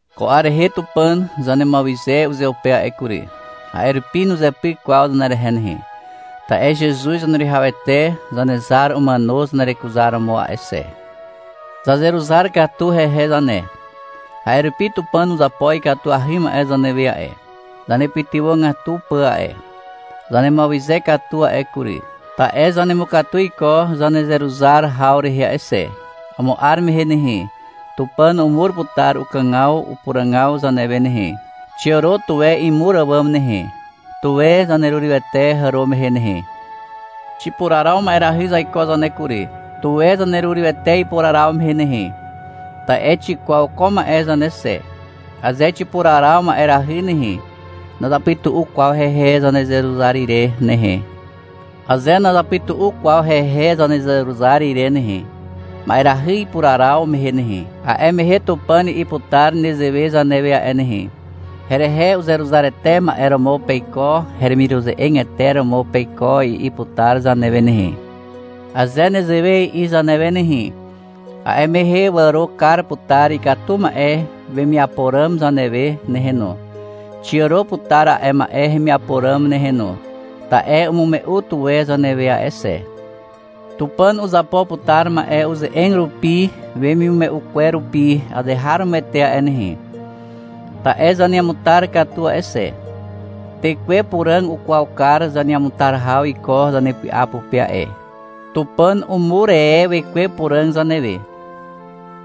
Ko 'ar rehe Tupàn zanemuawyze uzeupe a'e kury. A'e rupi nuzepyk kwaw zanerehe nehe, ta'e Zezuz Zaneruwihawete Zanezar umàno zanerekuzaromo a'e xe. Zazeruzar katu hehe zane, a'e rupi Tupàn uzapo ikatuahy ma'e zanewe a'e, zanepytywàgatu pà a'e. Zanemuawyze katu a'e kury, ta'e zanemukatu iko zanezeruzar haw rehe a'e xe. Amo 'ar mehe nehe, Tupàn umur putar ukàgaw upuràgaw zanewe nehe. Xiàro tuwe imur àwàm nehe. Tuwe zanerurywete hàro mehe nehe. Xipuraraw ma'erahy zaiko zane kury. Tuwe zanerurywete ipuraraw mehe nehe. Ta'e xikwaw ko ma'e zane xe. Aze xipuraraw ma'erahy nehe, nazapytu'u kwaw hehe zanezeruzar ire nehe. Aze nazapytu'u kwaw hehe zanezeruzar ire nehe, ma'erahy ipuraraw mehe nehe, a'e mehe Tupàn i'i putar nezewe zanewe a'e nehe. — Herehe uzeruzarete ma'e romo peiko, heremiruze'egete romo peiko, i'i putar zanewe nehe. Aze nezewe i'i zanewe nehe, a'e mehe wàro kar putar ikatu ma'e wemiapo ràm zanewe nehe no. Xiàro putar a'e ma'e hemiapo ràm nehe no. Ta'e umume'u tuwe zanewe a'e xe. Tupàn uzapo putar ma'e uze'eg rupi wemimume'u kwer rupi azeharomoete a'e nehe, ta'e zaneamutar katu a'e xe. Tekwe Puràg ukwaw kar zaneamutar haw iko zanepy'a pupe a'e. Tupàn umur e Wekwe Puràg zanewe.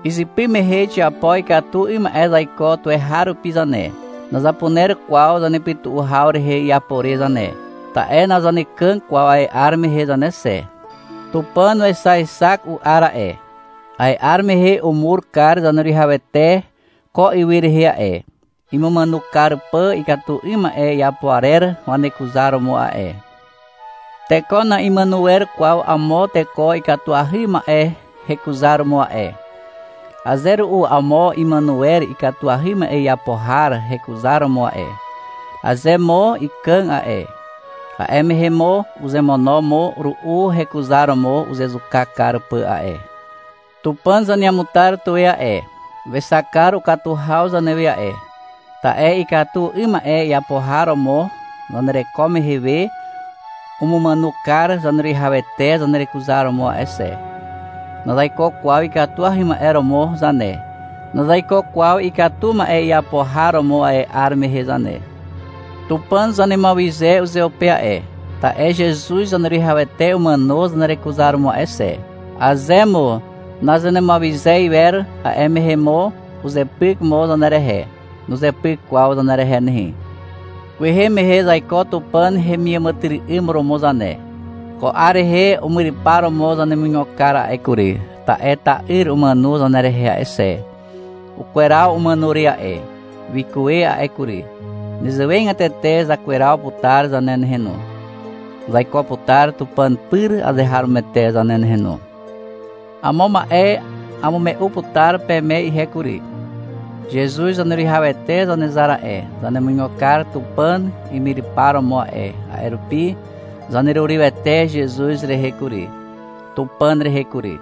Izypy mehe xiapo ikatu 'ym ma'e zaiko tuweharupi zane. Nazapuner kwaw zanepytu'u haw rehe iapo re zane, ta'e nazanekàg kwaw a'e 'ar mehe zane xe. Tupàn wexaexak u'ar a'e. A'e 'ar mehe umur kar Zaneruwihawete ko ywy rehe a'e, imumàno kar pà ikatu 'ym ma'e iapo arer wanekuzar romo a'e. Teko na'imàno wer kwaw amo teko ikatuahy ma'e hekuzaromo a'e. Aze ru'u amo imàno wer ikatuahy ma'e iapo har hekuzaromo a'e. Aze mo ikàg a'e, a'e mehe mo uzemono mo ru'u hekuzaromo uzezuka kar pà a'e. Tupàn zaneamutar tuwe a'e. Wexak kar ukatu haw zanewe a'e, ta'e ikatu 'ym ma'e iapo har romo zanereko mehe we umumàno kar Zaneruwihawete zanerekuzaromo a'e xe. Nazaiko kwaw ikatuahy ma'e romo zane. Nazaiko kwaw ikatu ma'e iapo har romo a'e 'ar mehe zane. Tupàn zanemuawyze uzeupe a'e, ta'e Zezuz Zaneruwihawete umàno zanerekuzaromo a'e xe. Aze mo nazanemuawyze iwer, a'e mehe mo uzepyk mo zanerehe. Nuzepyk kwaw zanerehe nehe. Kwehe mehe zaiko Tupàn hemiàmàtyry'ym romo zane. Ko 'ar rehe umyrypar romo zanemuigo kar a'e kury, ta'e ta'yr umàno zanerehe a'e xe. Ukweraw umàno re a'e, wikuwe a'e kury. Nezewegatete zakweraw putar zane nehe no. Zaiko putar Tupàn pyr azeharomoete zane nehe no. Amo ma'e amume'u putar peme ihe kury. Zezuz Zaneruwihawete Zanezar a'e, zanemuigo kar Tupàn imyrypar romo a'e, a'e rupi zanerurywete Zezuz rehe kury, Tupàn rehe kury.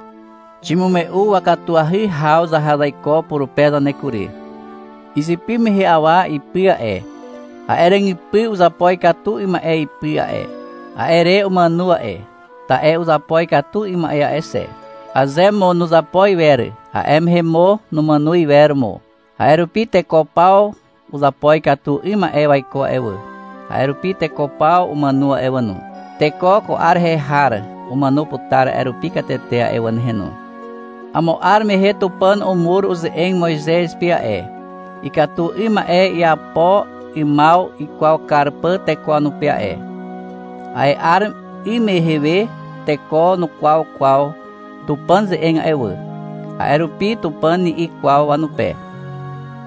Ximume'u wakatuahy haw zaha zaiko purupe zane kury. Izypy mehe awa ipy a'e, a'e ràgypy uzapo ikatu 'ym ma'e ipy a'e. A'e re umàno a'e, ta'e uzapo ikatu 'ym ma'e a'e xe. (Aze mo nuzapo iwer, a'e mehe mo numàno iwer mo.) A'e rupi teko paw uzapo ikatu 'ym ma'e waiko a'e wà. A'e rupi teko paw umàno a'e wà no. Teko ko 'ar rehe har umàno putar a'e rupi katete a'e wà nehe no. Amo 'ar mehe Tupàn umur uze'eg Moizez pe a'e, ikatu 'ym ma'e iapo 'ymaw ikwaw kar pà teko wanupe a'e. A'e 'ar 'ym mehe we teko nukwaw kwaw Tupàn ze'eg a'e wà. A'e rupi Tupàn ni'i kwaw wanupe.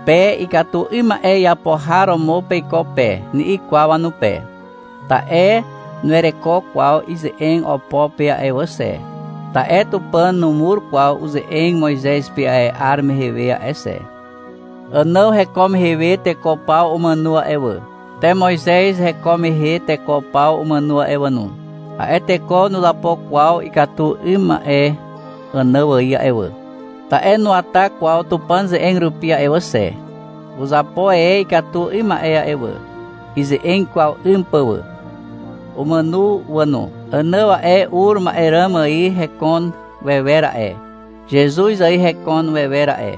— Pe ikatu 'ym ma'e iapo har romo peiko pe, ni'i kwaw wanupe, ta'e nuwereko kwaw ize'eg opo pe a'e wà xe, ta'e Tupàn numur kwaw uze'eg Moizez pe a'e 'ar mehe we a'e xe. Ànàw heko mehe we teko paw umàno a'e wà. Te Moizez heko mehe teko paw umàno a'e wà no. A'e teko nuzapo kwaw ikatu 'ym ma'e Ànàw ài a'e wà, ta'e nuwata kwaw Tupàn ze'eg rupi a'e wà xe. Uzapo e ikatu 'ym ma'e wà, ize'eg ikwaw 'ym pà wà. Umàno wà no. Ànàw a'e, ur ma'e ràm ài hekon wewer a'e, Zezuz ài hekon wewer a'e.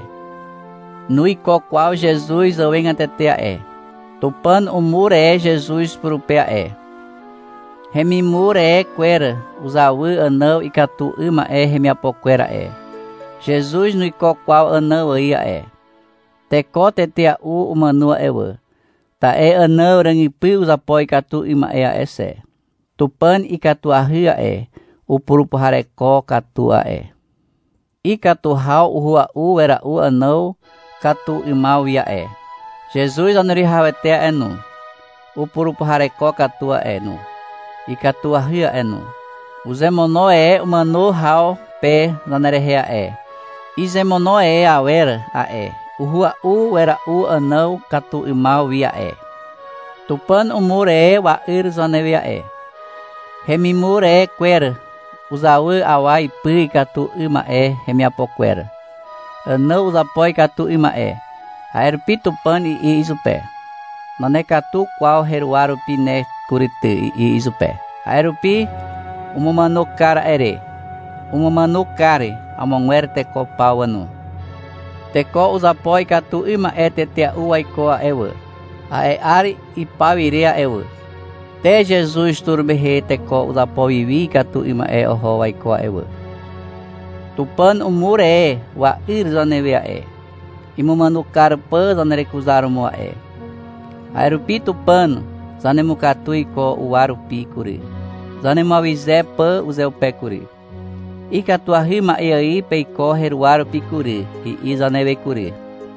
Nuiko kwaw Zezuz zàwegatete a'e. Tupàn umur e Zezuz purupe a'e. Hemimur e kwer uzawy Ànàw ikatu 'ym ma'e hemiapo kwer a'e. Zezuz nuiko kwaw Ànàw ài a'e. Teko tetea'u umàno a'e wà, ta'e Ànàw ràgypy uzapo ikatu 'ym ma'e a'e xe. Tupàn ikatuahy a'e, upurupuhareko katu a'e. Ikatu haw uhua'u wera'u Ànàw katu 'ymaw wi a'e. Zezuz Zaneruwihawete a'e no, upurupuhareko katu a'e no, ikatuahy a'e no. Uzemono e umàno haw pe zanerehe a'e. Izemono e awer a'e, uhua'u wera'u Ànàw katu 'ymaw wi a'e. Tupàn umur e wa'yr zanewe a'e. Hemimur e kwer uzawy awa ipy ikatu 'ym ma'e hemiapo kwer. Ànàw uzapo ikatu 'ym ma'e. A'e rupi Tupàn i'i izupe. — Nanekatu kwaw heruwa rupi ne kury ty, i'i izupe. A'e rupi umumàno kar a'e re. Umumàno kar amogwer teko paw wà no. Teko uzapo ikatu 'ym ma'e tetea'u waiko a'e wà, a'e 'ar ipaw ire a'e wà. Te Zezuz tur mehe teko uzapo wi wi ikatu 'ym ma'e oho waiko a'e wà. Tupàn umur e wa'yr zanewe a'e, imumàno kar pà zanerekuzaromo a'e. A'e rupi Tupàn zanemukatu iko uwa rupi kury, zanemuawyze pà uzeupe kury. — Ikatuahy ma'e ài peiko heruwa rupi kury, i'i zanewe kury.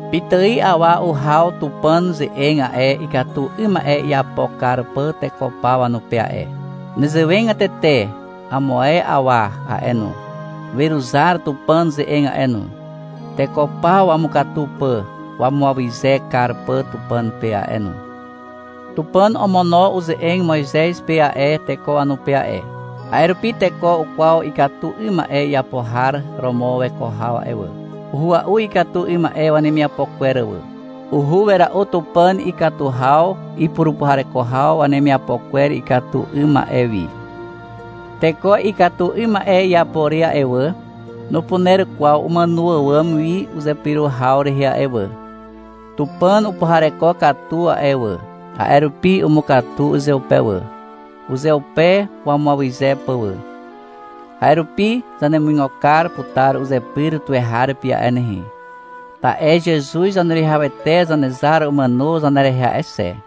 Pitài awa uhaw Tupàn ze'eg a'e, ikatu 'ym ma'e iapo kar pà teko paw wanupe a'e. Nezewegatete amo ae awa a'e no, weruzar Tupàn ze'eg a'e no, teko paw wamukatu pà wamuawyze kar pà Tupàn pe a'e no. Tupàn omono uze'eg Moizez pe a'e, teko wanupe a'e. A'e rupi teko ukwaw ikatu 'ym ma'e iapo har romo weko haw a'e wà. Uhua'u ikatu 'ym ma'e wanemiapo kwer wà. Uhua'u wera'u Tupàn ikatu haw ipurupuhareko haw wanemiapo kwer ikatu 'ym ma'e wi. Teko ikatu 'ym ma'e iapo re a'e wà, nupuner kwaw umàno àwàm wi uzepyro haw rehe a'e wà. Tupàn upuhareko katu a'e wà, a'e rupi umukatu uzeupe wà, uzeupe wamuawyze pà wà. A'e rupi zanemuigo kar putar uzepyr tuweharupi a'e nehe, ta'e Zezuz Zaneruwihawete Zanezar umàno zanerehe a'e xe.